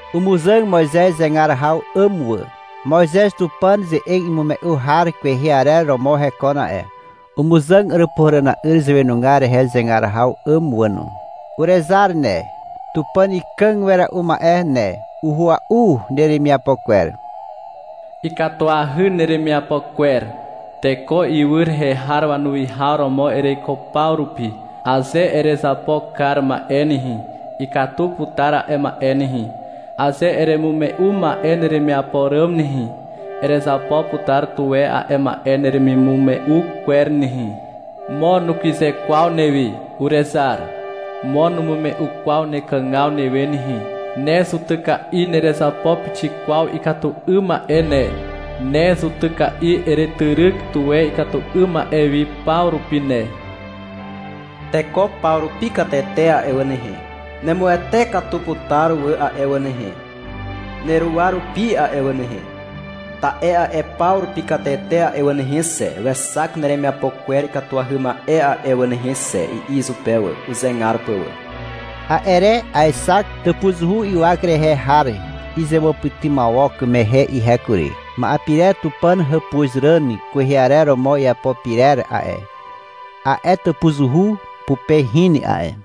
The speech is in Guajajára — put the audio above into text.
Umuzàg Moizez zegar haw 'àm wà. (Moizez Tupàn ze'eg imume'u har kwehe arer romo hekon a'e.) Umuzàg Àràpuhàràna'yr zàwenugar rehe zegar haw 'àm wà no. Urezar ne, Tupàn Ikàg Wera'u Ma'e ne. Uhua'u neremiapo kwer. Ikatuahy neremiapo kwer. Teko ywy rehe har wanuwihaw romo ereiko paw rupi. Aze erezapo kar ma'e nehe, Ikatu putar a'e ma'e nehe. Aze eremume'u ma'e neremiapo ràm nehe, Erezapo putar tuwe a'e ma'e neremimume'u kwer nehe, Mo nukyze kwaw newi, urezar. Mo numume'u kwaw nekàgaw newe nehe. Ne zutyka'i nerezapo pixik kwaw ikatu 'ym ma'e ne. Ne zutyka'i eretyryk tuwe ikatu 'ym ma'e wi paw rupi ne. Teko paw rupi katete a'e wà nehe, Nemuwete katu putar wà a'e wà nehe, Neruwa rupi a'e wà nehe. Ta'e a'e paw rupi katete a'e wà nehe xe, Wexak neremiapo kwer ikatuahy ma'e a'e wà nehe xe, i'i izupe wà, uzegar pà wà. A'e re aexak tàpuzuhu ywak rehe har izewàpytymawok mehe ihe kury. Ma'e pirer Tupàn hàpuzràn kwehe arer romo iapo pyrer a'e, a'e tàpuzuhu pupe hin a'e.